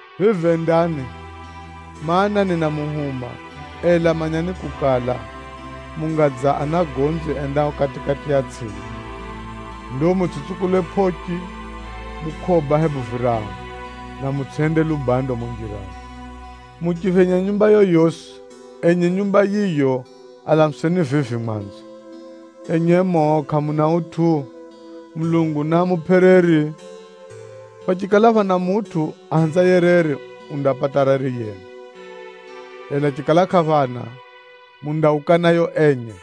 Vivi endani, mana, ninamuhuma, ela manyani kukala, munga dza anagonzi endao kati-kati ya tsʼimba. Ndo mutsʼitsukule pʼochi, mukʼoba hebu virahu, na mutsʼihende lubando mumo njirani. Muchiphenya nyumba yoyosi, enye nyumba yiyo alamuseni vivi mwanzo, ‘Enye muno kʼamuna utʼu? Mulungu naamupʼe reri!’ Phachikala phana mutʼu ahenzaye reri, undapata reri yenu, ela chikala kʼaphana, mundauka nayo enye.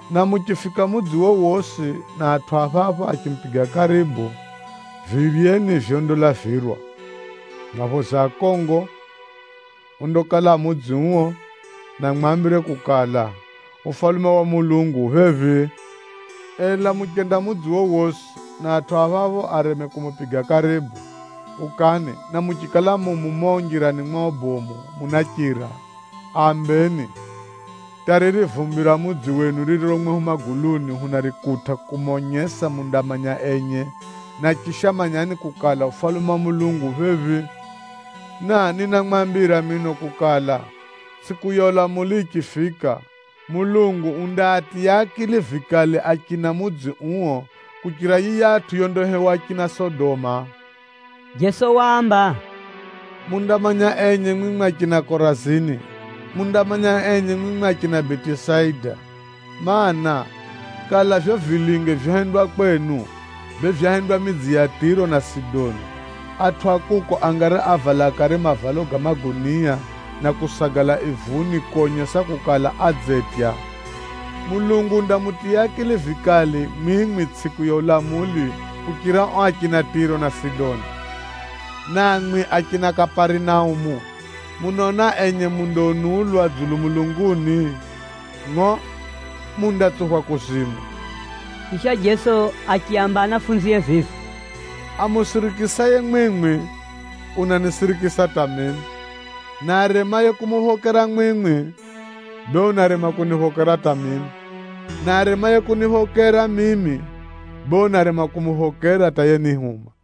Na muchifika mudzi wowosi na atʼu a phapho achimupiga karibu, viryeni vyondalavirwa, mwaphoze akongo ondakala a mudzi uo, na muambire kukala, ‘Ufalume wa Mulungu u phephi.’ Ela muchenda mudzi wowosi, na atʼu a phapho areme kumupiga karibu, ukani na muchikala mu mumo njirani mwao bomu munachira, aambeni, ‘Hata riri vumbi ra mudzi wenu ririro mwehu maguluni hunarikutʼa kumonyesa mundamanya enye. Na chisha manyani kukala, Ufalume wa Mulungu ufika phephi.’ Na ninamwambira mino kukala, tsʼiku ya ulamuli yichifika, Mulungu undaatiya akili vikali achina mudzi uo kuchira yiyatʼu yondahewa achina Sodoma.” Jeso waamba, “Mundamanya enye mwimwi achina Korazini! Mundamanya enye mwimwi achina Betisaida, mana, kala vivyo vilinge vyohendwa kwenu, bee vyahendwa midzi ya Tʼiro na Sidoni, atʼu a kuko angari ávala kare mavalo ga magunia, na kusagala ivuni konyesa kukala, adzetya. Mulungu undamutiya akili vikali mwimwi tsʼiku ya ulamuli kuchira ao achina Tʼiro na Sidoni. Na mwimwi achina Kaparinaumu, munaona enye mundaunulwa dzulu mulunguni? Ngʼo! Mundatsuphwa kuzimu!” Chisha Jeso achiaamba anafunzie vivi, “Amusirikisaye mwimwi, unanisirikisa hata mimi, na aremaye kumuphokera mwimwi, bee unarema kuniphokera hata mimi. Na aremaye kuniphokera mimi, bee unarema kumuphokera hata yenihuma.”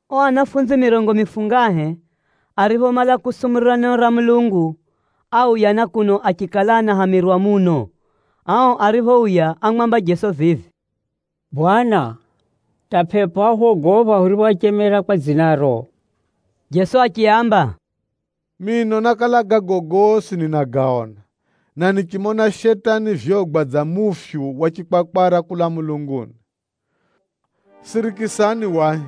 Ao anafunzi mirongo mifungahe Nakala zinjine zinaonjeza: na airi. ariphomala kusumurira neno ra Mulungu, áuya na kuno achikala anahamirwa muno. Ao ariphouya ámwamba Jeso vivi, “Bwana, hata pʼepʼo áhwogopha huriphoachemera kwa dzinaro!” Jeso achiaamba, “Mino nákala gago gosi ninagaona, na nichimona Shetani vyogwa dza mufyu wa chikwakwara kulaa mulunguni. Sirikisani wahi,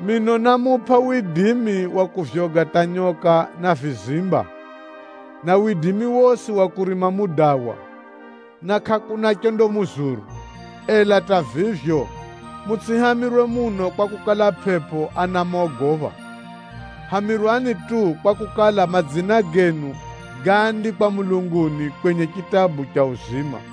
mino námupʼa widimi wa kuvyoga hata nyoka na vizimba, na widimi wosi wa kurima mudawa, na kʼakuna chondamuzuru. Ela hata vivyo, mutsʼihamirwe muno kwakukala, pʼepʼo anamogopha, hamirwani tu kwakukala, madzina genu gáandikwa mulunguni, kwenye chitabu cha uzima.”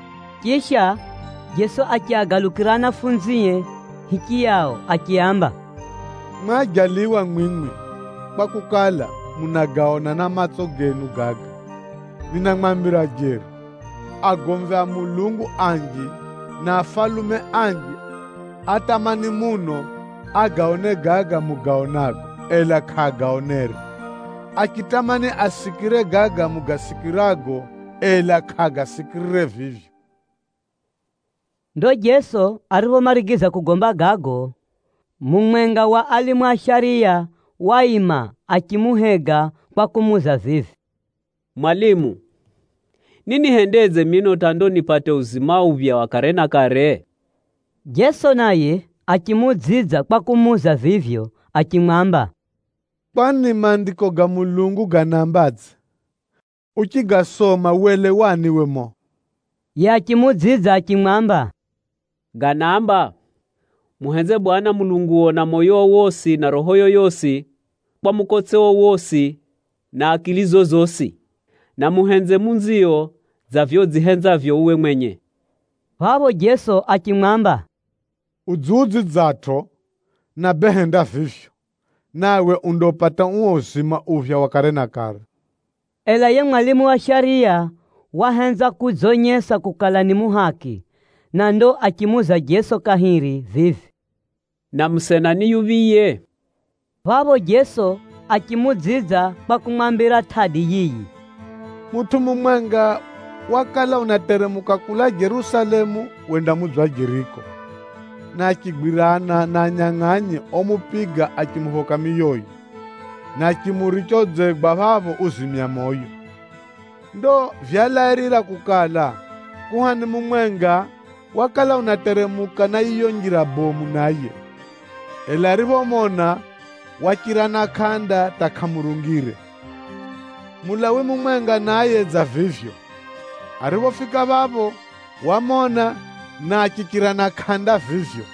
Chisha, Jeso achiagalukira anafunzie hichiyao achiaamba, “Baha mwimwi, kwakukala, munagaona na matso genu gaga! Ninamwambira jeri, agomvi a Mulungu anji na afalume anji átamani muno agaone gaga mugaonago, ela kʼaagaonere. Achitamani asikire gaga mugasikirago, ela kʼaagasikirire vivyo.” Ndo Jeso ariphomarigiza kugomba gago, mumwenga wa alimu a shariya waima achimuhega kwa kumuuza vivi, “Mwalimu, ninihendedze mino hata ndo nipate uo uzima uphya wa kare na kare?” Jeso naye achimuudzidza kwa kumuuza vivyo achimwamba, “Kwani Maandiko ga Mulungu ganaambadze? Uchigasoma welewani uwe mumo?” Yiye achimuudzidza achimwamba, “Ganaamba, ‘Muhenze Mwenyezi Mulungu, Mulungu wenu na moyo wenu wosi na roho renu rosi, na kwa mukotse wenu wosi na akili zenu zosi. Na muhenze jiranio dza vivyo udzihenzavyo uwe mwenye.’” Phapho Jeso achimwamba, “Udziudzidzatʼo! Na bee henda vivyo, nawe undaupata uo uzima uphya wa kare na kare.” Ela yiye mwalimu wa shariya wahenza kudzonyesa kukala ni muhaki, na ndo achimuuza Jeso kahiri vivi, “Na jirani wangu ni yuphiye?” Phapho Jeso achimuudzidza kwa kumwambira tʼadi yiyi: “Mutʼu mumwenga wakala unateremuka kulaa Jerusalemu wenda mudzi wa Jeriko, na achigwirana na anyangʼanyi omupiga achimuphoka miyoye, na achimuricha udzegwa phapho uzimya moyo. Ndo vyalairira kukala, kuhani mumwenga wakala unateremuka na yiyo njira bomu naye, ela ariphomona, wachira na kʼanda hata kʼamurungire. Mulawi mumwenga naye dza vivyo, ariphofika phapho wamona na achichira na kʼanda vivyo.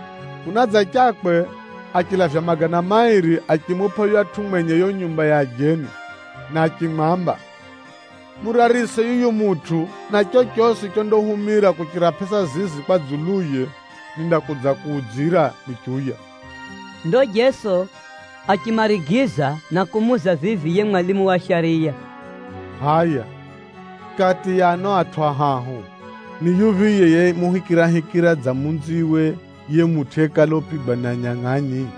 Kunadzachakwe, achilavya magana mairi Chiyunani chinaamba: dinari mbiri. achimupʼa yuyatʼu mwenye yiyo nyumba ya ajeni, na achimwamba, ‘Murarise yuyu mutʼu, na chochosi chondahumira kuchira pʼesa zizi kwa dzuluye, nindakudzakuudzira nichiuya.’” Ndo Jeso achimarigiza na kumuuza vivi yiye mwalimu wa shariya, “Hʼaya, kati ya ano atʼu ahahu, ni yuphiye yemuhikirahikira dza jiraniwe yiye mutʼu yekala upigwa ni anyangʼanyi?”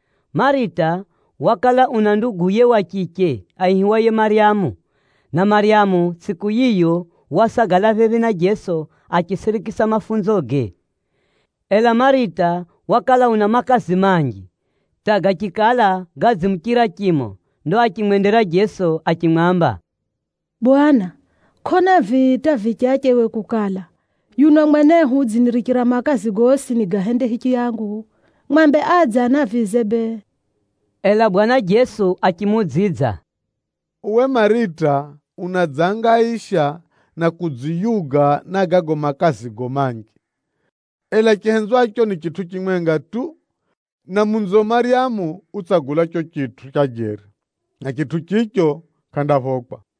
Marita wakala una nduguye wa chiche aihiwaye Maryamu, na Maryamu tsʼiku yiyo wasagala phephi na Jeso achisirikisa mafunzoge. Ela Marita wakala una makazi manji hata gachikala gadzimuchira chimo. Ndo achimwendera Jeso achimwamba, “Bwana, kʼona vii hata vichache uwe kukala, yuno mwenehu udzinirichira makazi gosi nigahende hichiyangu? Mwambe adze anavize bee.” Ela Bwana Jeso achimuudzidza, “Uwe Marita unadzangaisha, na kudziyuga na gago makazigo manji. Ela chihenzwacho ni chitʼu chimwenga tu, na munzio Maryamu utsagula chicho chitʼu cha jeri, na chitʼu chicho kʼandaphokwa.”